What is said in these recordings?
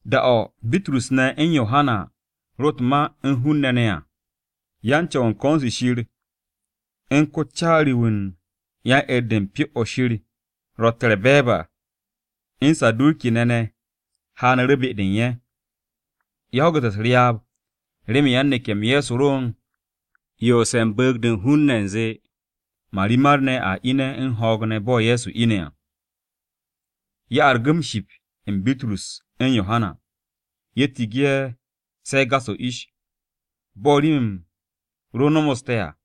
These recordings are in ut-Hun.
Da-o̱ Bitrus ne̱ u̱n Yohana ro u̱t-ma u̱n hun-ne̱ ne̱ à, yan-Co̱w u̱n ko̱n-se Shir u̱n ko-caari-wu̱ u̱n yan-'er-de u̱n Pyo-o̱ Shir ne̱, u̱n Saduki-ne̱ ne̱ haanu̱ru̱ be-de u̱n ye̱. Ye̱ ho̱gu̱te̱ u̱s-ryaab remen yan-neke̱-m Ye̱so ro u̱n yoose̱ u̱n bu̱u̱g-de u̱n hun-ne̱ u̱nze marimar-ne̱ a ine̱ u̱n ho̱o̱g ne̱ bo̱ Ye̱so ine̱ à. Ye̱ argu̱ m-ship u̱n Bitrus u̱n Yohana. Ye̱ tigi ye̱ se̱ gas-o̱ ish, bo̱ rim-m ro nomoste̱ à.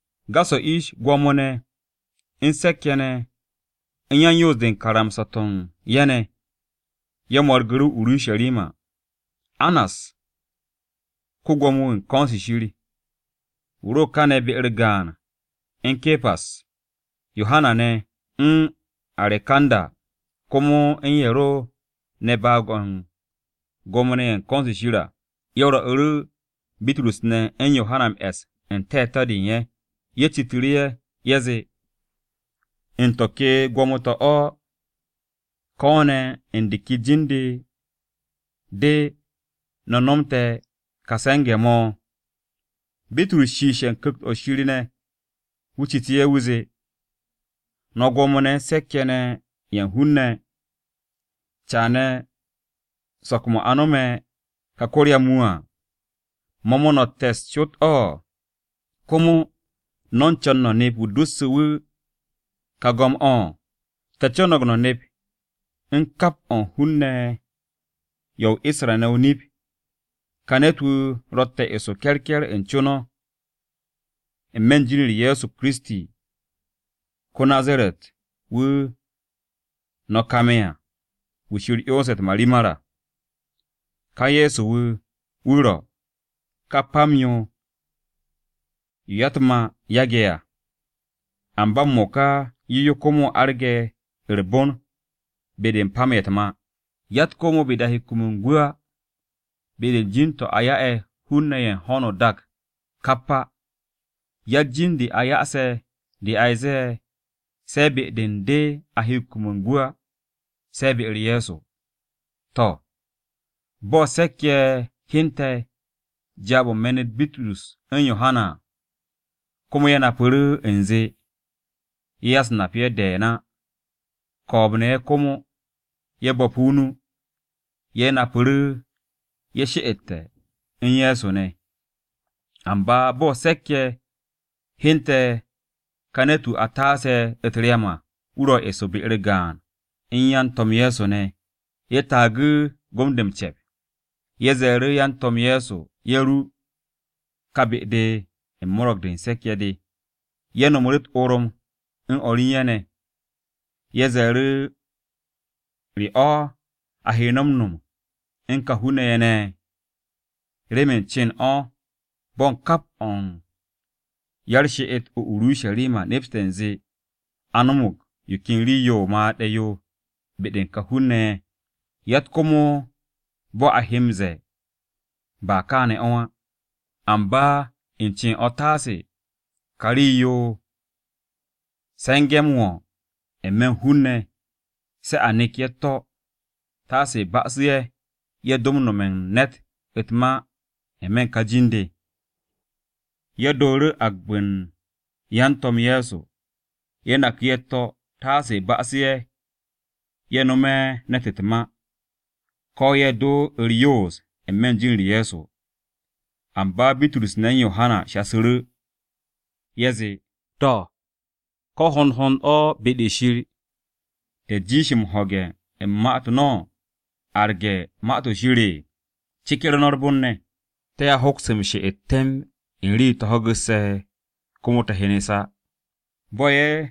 Gas-o̱ ish, gwo̱mo-ne̱ u̱n se̱k-ye̱ ne̱ u̱n ye̱ ne̱, u̱n yan-yoos-de u̱n karamsa-to̱ u̱n ye̱ ne̱, ye̱ mo̱rgu̱ru̱ o-Urusharima. Annas, ko-Gwo̱mo-wu̱ u̱n ko̱n-se Shir, wu̱ ro kane̱ be-u̱r gaan u̱n Ke̱pas, Yohana ne̱, u̱n Arekanda, komo u̱n ye̱ ro ne̱ baag-o̱ u̱n Gwo̱mo-ne̱ ye̱ u̱n ko̱n-se Shir à. Ye̱ rwo̱'u̱ Bitrus ne̱ u̱n Yohana m-e̱s u̱n te̱te̱-de u̱n ye̱. Ye̱ citu̱ru̱ ye̱, ye̱ zee, “¿U̱n to̱ ke gwo̱mo-to̱ o̱, ko̱ ne̱ u̱n de ke jin-de no̱ nomte̱ ka se̱nge̱-mo̱?” Bitrus shiishe̱ u̱n Ku̱kt-o̱ Shir ne̱, wu̱ citu̱ ye̱. Wu̱ zee, “No̱ gwo̱mo-ne̱ u̱n se̱k-ye̱ ne̱ ye̱ u̱n hun-ne̱! Caane̱ so̱k-mo̱ a nome̱ ka ko-ryam-wu̱ à, ¿mo̱ mo̱ no̱ te̱ u̱s-cot o̱? ¿Komo no̱ u̱n co̱n no̱ nep wu̱ dosse̱ wu̱ ka go̱m-o̱? Te̱ co̱no̱g no̱ nep u̱n kap o̱ u̱n hun-ne̱ ye̱ o-Isra-ne̱ o-nip. Yo hante̱ kà ne̱t-wu̱ ro̱tte̱ eso ke̱rke̱r u̱n co-o no̱ à, n-me̱ u̱n jin-u̱r Ye̱so Kiristi ko-Nazaret o̱, wu̱ no̱ kame̱ à, wu̱ Shir 'yonse̱ u̱t-marimar à. Ka Ye̱so-wu̱, wu̱ ro̱: “ ‘Ka pam-yo, yo ya-u̱t-mà yage̱ à, amba m-mo̱ka yo yo komo arge̱ u̱r-bon be-de u̱n pam-ye̱ u̱t-mà.’ Yatt komo be-de a he kum u̱n gwu̱ á, be-de u̱n jin-to̱ a ya'e̱ hun-ne̱ ye̱ u̱n ho̱no o-dak kap à. Yatt jin-de a ya'ase̱ de a ze̱e̱ se̱ be-de u̱n de a he kum u̱n gwu̱ á, se̱ be-u̱r Ye̱so.” To̱, bo̱ se̱k-ye̱ hyente̱ jaab-o̱ u̱n me̱n-u̱t Bitrus u̱n Yohana ne̱ à, komo ye̱ napu̱ru̱ u̱nze ye̱ ya-u̱s-nap-ye̱ de̱e̱n á, ko̱o̱b-ne̱ ye̱ komo, ye̱ bo̱pu̱ o-nu, ye̱ napu̱ru̱ ye̱ she'ete̱ u̱n Ye̱so ne̱. Amba bo̱ se̱k-ye̱ hyente̱ ka ne̱t-wu̱ a taase̱ u̱t-ryam à, wu̱ ro̱ eso be-u̱r gaan u̱n yan-To̱m Ye̱so ne̱, ye̱ taagu̱ gom-de m-ce̱p. Ye̱ ze̱e̱ru̱ yan-To̱m Ye̱so ye̱ ru u̱n ka be-de u̱n Mo̱ro̱g-de u̱n Se̱k-ye̱ de, ye̱ no̱mu̱ru̱ u̱t-orom u̱n o̱r u̱n ye̱ ne̱ ne̱. Ye̱ ze̱e̱ru̱, “¿Re o̱ a he no̱ m-no̱m u̱n ka hun-ne̱ ye̱ ne̱? Remen u̱n cen o̱ bo̱ u̱n kap o̱ u̱n ya-u̱r-she'et o-Urusharima nepste̱ u̱nze a no̱mo̱g yo ken rii-yo o-made̱ yo be-de u̱n ka hun-ne̱ ye̱. Yatt komo bo̱ a he m-ze̱e̱ ‘Ba kaane̱ o̱ á.’ Amba u̱n cen o̱ taase ka rii-yo se̱nge̱-m wo̱ n-me̱ u̱n hun-ne̱, se̱ a nek ye̱ u̱t-to̱, taase ba'asu̱ ye̱, ye̱ do nome̱ u̱n ne̱t u̱t-ma n-me̱ u̱n ka jin-de.” Ye̱ dooru̱ agbe̱ u̱n yan-To̱m Ye̱so, ye̱ naku̱ ye̱ u̱t-to̱, taase ba'asu̱ ye̱, ye̱ nome̱ ne̱t u̱t-ma, ko̱ ye̱ do u̱r-yoos n-me̱ u̱n jin-u̱r Ye̱so. Amba Bitrus ne̱ u̱n Yohana shasu̱ru̱, ye̱ zee, “To̱, ¿ko̱ hond hond o̱ be-de Shir te̱ jiish m-ho̱ge̱ u̱n ma-u̱t no̱ arge̱ Ma-to̱ Shir? Ceker no̱ u̱r-bon ne̱. Te̱a hoks m-she'et temb u̱n rii-yo te̱ ho̱gu̱sse̱, komo te̱ hyenes á.” Bo̱ ye̱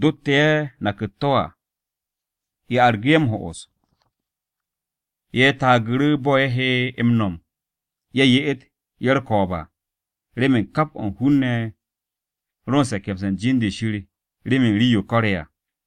dotte̱ ye̱ nak u̱t-to̱ à, ye̱ argu̱ ye̱ m-ho'os. Ye̱ taagu̱ru̱ bo̱ ye̱ he m-no̱m ye̱ ye'et ye̱ u̱r-ko̱o̱b à, remen kap o̱ u̱n hun-ne̱ ro u̱n se̱ke̱mse̱ u̱n jin-de Shir remen rii-yo ko̱re̱ à.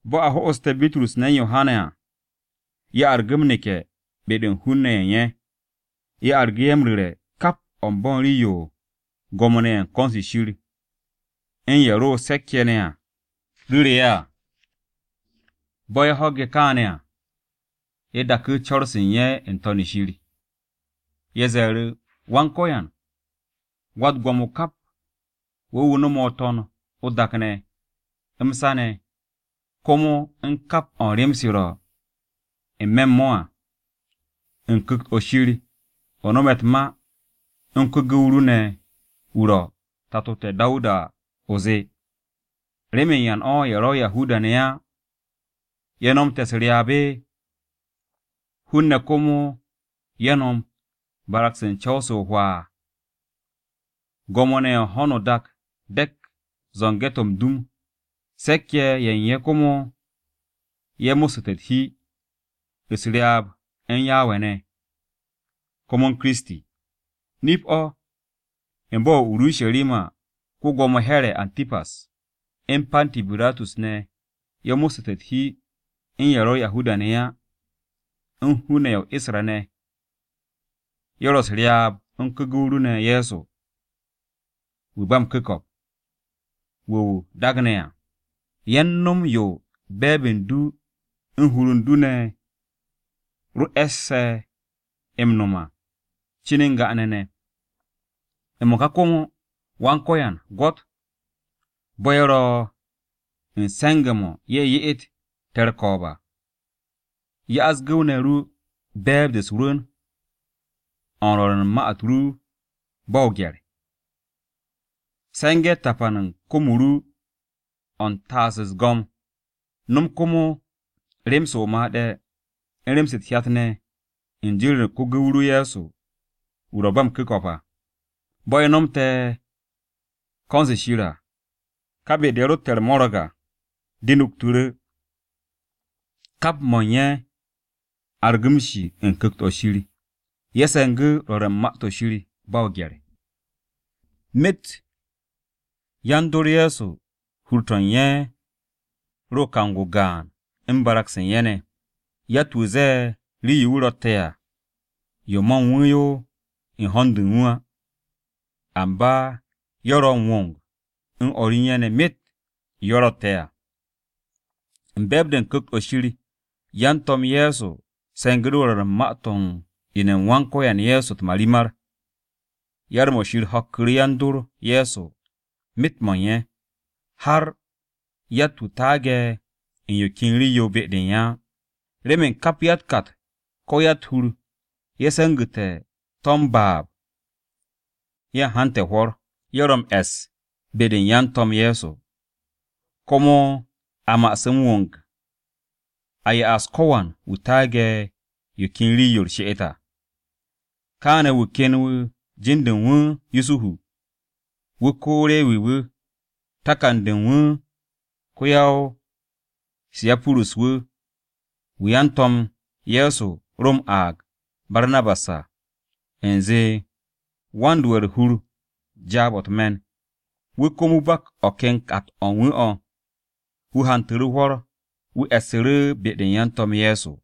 Bo̱ a ho'oste̱ Bitrus ne̱ u̱n Yohana à, ye̱ argu̱ m-neke̱ be-de u̱n hun-ne̱ ye̱ u̱n ye̱. Ye̱ argu̱ ye̱ m-ru̱re̱ kap o̱ u̱n bo̱ u̱n rii-yo Gwo̱mo-ne̱ ye̱ u̱n ko̱n-se Shir, u̱n ye̱ ro se̱k-ye̱ ne̱ ru̱ru̱ ye̱ à. Bo̱ ye̱ ho̱ge̱ kaane̱ à, ye̱ daku̱ co̱r-se u̱n ye̱ n-to̱n Shir. Ye̱ ze̱e̱ru̱, “Wan-Ko̱yan, Wa-u̱t-Gwo̱mo kap, wo̱ wu̱ no̱me̱ o-To̱n o-dak ne̱, m-sa ne̱, komo u̱n kap o̱ u̱n rem-se ro̱ n-me̱ u̱n to̱ à. U̱n Ku̱kt-o̱ Shir o no̱me̱ u̱t-ma u̱n ko-gu̱w ru ne̱ wu̱ ro̱, tato te̱ Dawuda à, o zee, “ ‘¿Remen ya u̱n o̱ ye̱ ro̱ Yahuda-ne̱ á ye̱ nomte̱ u̱s-ryaab? ¿Hun-ne̱ komo ye̱ nom barag-se u̱n co̱w-se o-hwaa? Gwo̱mo-ne̱ ye̱ u̱n ho̱no o-dak dek zo̱nge̱-to̱ m-dum, se̱k-ye̱ ye̱ u̱n ye̱ komo ye̱ mo̱ssu̱ u̱t-hi, u̱s-ryaab u̱n Yawe ne̱, komo u̱n Kiristi.’ Nip-o̱, u̱n bo̱-o̱ Urusharima ko-Gwo̱mo Here̱ [Atipas] u̱n Panti Biratus ne̱ ye̱ mo̱ssu̱te̱ u̱t-hi u̱n ye̱ ro̱ Yahuda-ne̱ á, u̱n hun-ne̱ ye̱ o-Isra-ne̱, ye̱ ro̱ u̱s-ryaab u̱n ko-gu̱w ru ne̱ Ye̱so, wu̱ ba m-ku̱ko̱p, wu̱ o daagne̱ à. Ye̱ u̱n no̱m u̱n yo be̱e̱b u̱n du u̱n hur u̱n du ne̱ e̱sse̱ m-no̱m à cin n-ga ne̱ ne̱. M-mo̱ka komo, Wan-Ko̱yan, gwo̱t bo̱ ye̱ ro̱ u̱n se̱nge̱-mo̱ ye̱ ye'et te̱ u̱r-ko̱o̱b à, 'ya gu̱w-ne̱ ru be̱e̱b-de u̱s-rwu̱n de u̱n rwo̱r u̱n ma-u̱t ru ba o-gye̱r. Se̱nge̱ tapan u̱n kom-o ru o̱ u̱n taas u̱s-go̱m, no̱m komo rem-se o-made̱, u̱n rem-se u̱t-hyat ne̱ u̱n jin-u̱r ko-gu̱w ru Ye̱so wu̱ ro̱ ba m-ku̱ko̱p à.” Bo̱ ye̱ nomte̱ ko̱n-se Shir à, ka be-de ye̱ rotte̱ u̱r-mo̱ro̱g à, de nuktu̱ru̱. Kap mo̱ u̱n ye̱ argu̱ m-shi u̱n Ku̱kt-o̱ Shir, ye̱ se̱ngu̱ rwo̱r u̱n ma-to̱ Shir ba o-gye̱r. Myet yan-dor Ye̱so hur-to̱ u̱n ye̱ ro kang-o gaan u̱n barag-se u̱n ye̱ ne̱. Yatt-wu̱ ze̱e̱ rii-yo wu̱ ro̱tte̱ à, yo ma u̱n wu̱ yo u̱n ho̱n du u̱n wu̱ á, amba ye̱ ro̱ m-wong u̱n o̱r u̱n ye̱ ne̱ myet yo ye̱ ro̱tte̱ à. U̱n be̱e̱b-de u̱n Ku̱kt-o̱ Shiryan-To̱m Ye̱so se̱ngu̱ru̱ rwo̱r u̱n ma-to̱ u̱n ine̱-m Wan-Ko̱yan Ye̱so u̱t-marimar. Yar-mo̱ Shir ho̱ku̱ru̱ yan-dor Ye̱so myet-mo̱ u̱n ye̱. Har yatt-wu̱ taage̱ u̱n yo ken rii-yo be-de u̱n ye̱ á. Remen kap ya-u̱t-kat ko̱ ya-u̱t-hur ye̱ se̱ngu̱tu̱ to̱ m-baab, ye̱ u̱n hante̱ hwo̱r. Ye̱ ro m-e̱ss be-de u̱n yan-To̱m Ye̱so, komo a ma'asu̱ m-wong a ya'as ko̱wan wu̱ taage̱ u̱n yo ken rii-yo u̱r-she'et yo à. Kaane̱ wu̱ ken wu̱ no̱me̱ jin-de u̱n wu̱ Yusuhu. Wu̱ ko-Rewi-wu̱, takan-de u̱n wu̱ ko-ya-o-Sayipurus-wu̱, wu̱ yan-To̱m Ye̱so ro m-aag Barnabas à, (U̱nze, Wan-do'e̱ u̱r-hur jaab-o̱ u̱t-me̱n.) Wu̱ komo wu̱ bak o̱ ken kat-o̱ u̱n wu̱ o̱, wu̱ hantu̱ru̱ hwo̱r, wu̱ e̱ssu̱ru̱ be-de yan-To̱m Ye̱so.